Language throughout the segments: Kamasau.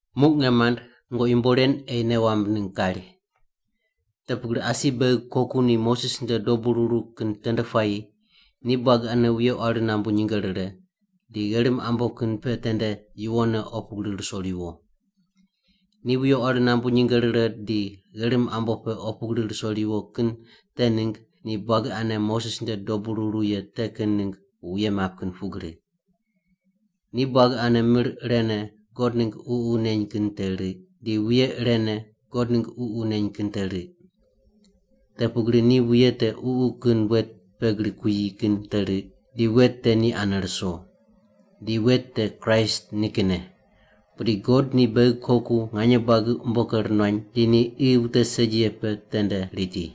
Muq nge mand, nungoqi yumbo ren ei nei wamb ningg kari. Te pugri asi beghi koku ni Moses nde dobu ruru kin tende puayi ni buagi ane wuye quari nambu nyinge rire, di gherim ambo kin pe tende yuwonne opu gri ruso riwo. Ni wuye quari nambu nyinge rire di gherim ambo pe opu gri ruso riwo kin te ningg ni buagi ane Moses nde dobu ruru ye te kin ningg wuye map kin pugri. Ni buagi ane mir irene God ningg Ququ neny kin te riq, di wuye irene God ningg Ququ neny kin te riq. Te pugri ni wuye te ququ kin wet pe gri kuyi kin te riq, di wet te ni ane ruso. Di wet te Kraist nikinne. Pudi God ni beghi koku nganye buagi umbo ker nuany di ni qi wute segi ye pe tende riti.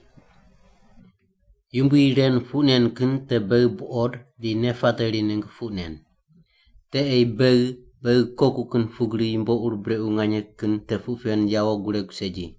Yumbui ren puq nen kin te beghi buqod di nei pateri ningg puq nen. Te ei beghi, beghi koku kin pugri yumbo ur brequ nganye kin te puq pen yawo guregu segi.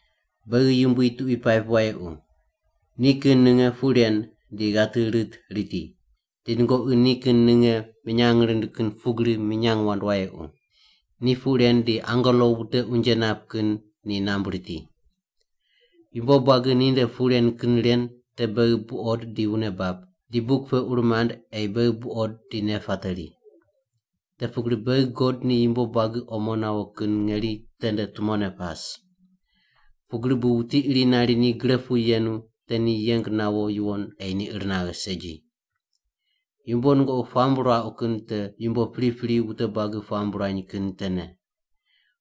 Beghi Yumbui tuqui paip wayequ. Ni kin ninge puq ren di ghati rit riti. Di nungoqi ni kin ninge minyang rind kin pugri minyang wand wayequ. Ni puq ren di angelo wute unje nap kin ni nambui riti. Yumbo buagi ninde puq ren kin ren te beghi buqod di wune bab, di buk pe ur mand ei beghi buqod di nei pateri. Te pugri beghi God ni yumbo buagi omo nawo kin ngeri tende tumone pas. Pugri bu wuti iri nari ni gre pu yenu te ni yeng nawo yuwon ei ni ir naghe segi. Yumbo nungoqi puamb ruauq kin te yumbo pripri wute buagi puamb ruany kin tene.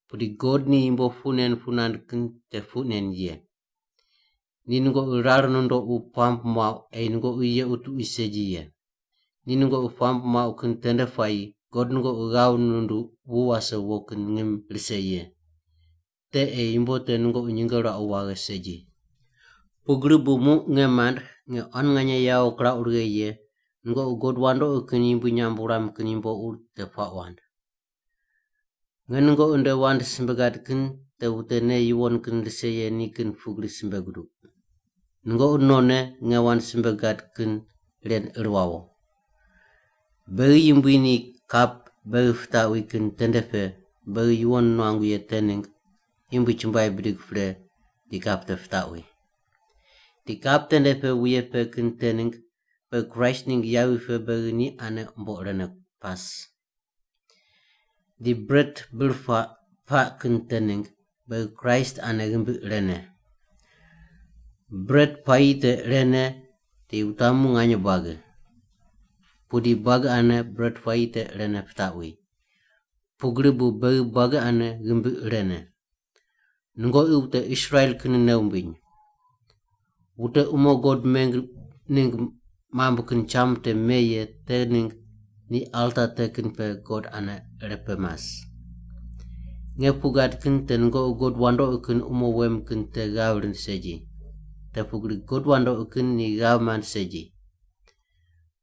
Pudi God ni yumbo puq nen puq nand kin te puq nen ye. Ni nungoqi rar nundoqu puamb muauq ei nungoqi yequ tuqui segi ye. Ni nungoqi puamb muauq kin tende puayi God nungoqi ghav nunduq wu wase wo kin ngim rise ye. Te ei yumbo te nungoqi nyinge ruauq waghe segi. Pugri bu muq nge mand nge quan nganye yawo kirauq righe ye, nungoqi god wandoqi kin yumbui nyamb wuram kin yumbo ur te puaq wand. Nge nungoqi nde wand simbe gad kin te wute nei yuwon kin rise ye ni kin pugri simbe guduq. Nungoqi nonne nge wand simbe gad kin ren ir wawo. Beghi Yumbui ni kap beghi pitaqwi kin tende pe beghi yuwon nuangu ye te ningg Yumbui chumbuai bidig pre di kap te pitaqwi. Di kap tende pe wuye pe kin te ningg beghi Kraist ningg yavi pe beghi ni ane umbo irene pas. Di bret bir puaq paq kin te ningg beghi Kraist ane ghimbi irene. Bret puayi te irene di wutamu nganye buagi. Pudi buagi ane bret puayi te irene pitaqwi. Pugri bu beghi buagi ane ghimbi irene. Nungoqi wute Israel kin nei wumbiny. Wute umo God meng ningg mambui kin cham te me ye te ningg ni alta te kin pe God ane irepe mas. Nge puq gad kin te nungoqi god wandoqi kin umo wem kin te ghav rind segi. Te pugri god wandoqi kin ni ghav mand segi.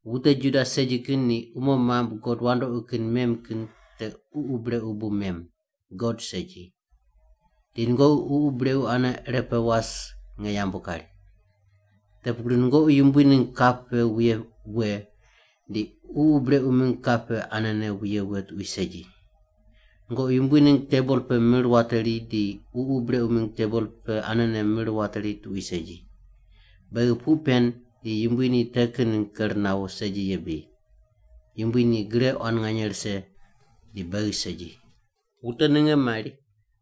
Wute Juda segi kin ni umo mambui god wandoqi kin mem kin te ququ brequ bu mem, God segi. Di nungoqi ququ brequ ane irepe was nge yambu kari. Te pugri nungoqi Yumbui ningg kap pe wuye we di ququ brequ mingg kap pe anene wuye we tuqui segi. Nungoqi Yumbui ningg tebol pe mir wateri di ququ brequ mingg tebol pe anene mir wateri tuqui segi. Beghi puq pen di Yumbui ni te kin ningg ker nawo segi ye bri? Yumbui ni gre quan nganye rise di beghi segi. Wute ninge mari,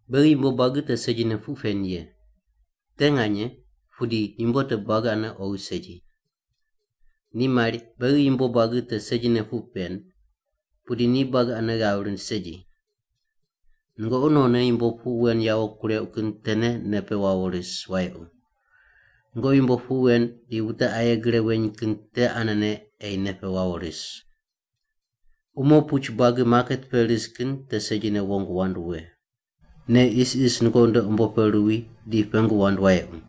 “Beghi yumbo buagi te segine puq pen ye.” Te nganye, pudi yumbo te buagi ane oghi segi. Ni mari, “Beghi yumbo buagi te segine puq pen.” Pudi ni buagi ane ghav rind segi. Nungoqi nonne yumbo puq wen yawo kureuq kin tene nei pe wawo ris wayequ. Nungoqi yumbo puq wen di wute aye gre weny kin te anene ei nei pe wawo ris. Umo puch buagi maket pe ris kin te segine wong wand we. Nei isis nungoqi nde umbo pe ruwi di pengu wand wayequ.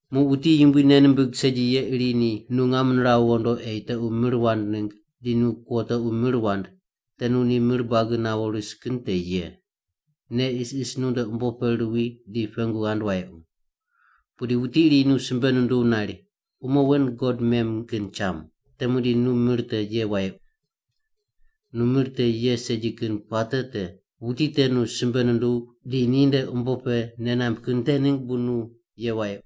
Muq wuti Yumbui nei nimbig segi ye iri ni nu ngam niraw ghondo ei tequ mir wand ningg di nu kuo tequ mir wand, te nu ni mir buagi nawo ris kin te ye. Nei isis nunde umbo pe ruwi di pengu ghand wayequ. Pudi wuti iri nu simbe nunduw nari, “Umo wen god mem kin cham,” te muqdi nu mir te ye wayequ. Nu mir te ye segi kin puate te: wuti te nu simbe nunduw di ninde umbo pe nei namb kin te ningg bu nu ye wayequ.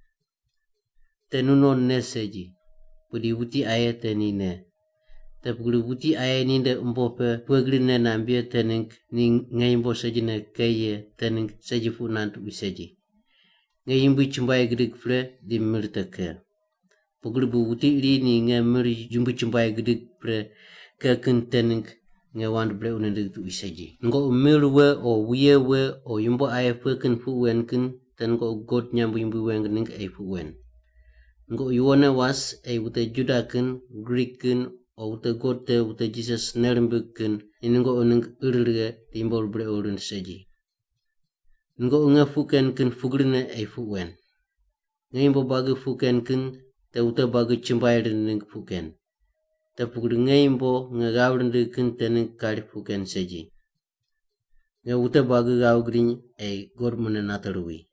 Te nunon nei segi, pudi wuti aye te ni nei. Te pugri wuti aye ninde umbo pe pughe gri nei namb ye te ningg ni nge yumbo segine ke ye te ningg segi puq nand tuqui segi. Nge Yumbui chumbuai gidig pre di mir te ke. Pugri bu wuti iri ni nge mir Yumbui chumbuai gidig pre ke kin te ningg nge wand brequ nindigh tuqui segi. Nungoqi mir we o wuye we o yumbo aye pughe kin puq wen kin te nungoqi God nyamb yumbui weng ningg ei puq wen. Nungoqi yuwonne was ei wute Juda kin, Grik kin o wute God te wute Jisas nei rimbig kin ni nungoqi ningg ir righe di yumbo ur brequ rind segi. Nungoqi nge puq ken kin pugrine ei puq wen. Nge yumbo buagi puq ken kin te wute buagi chumbuai rind ningg puq ken. Te pugri nge yumbo nge ghav rindigh kin te ningg kari puq ken segi. Nge wute buagi ghav gidiny ei God mune nate ruwi.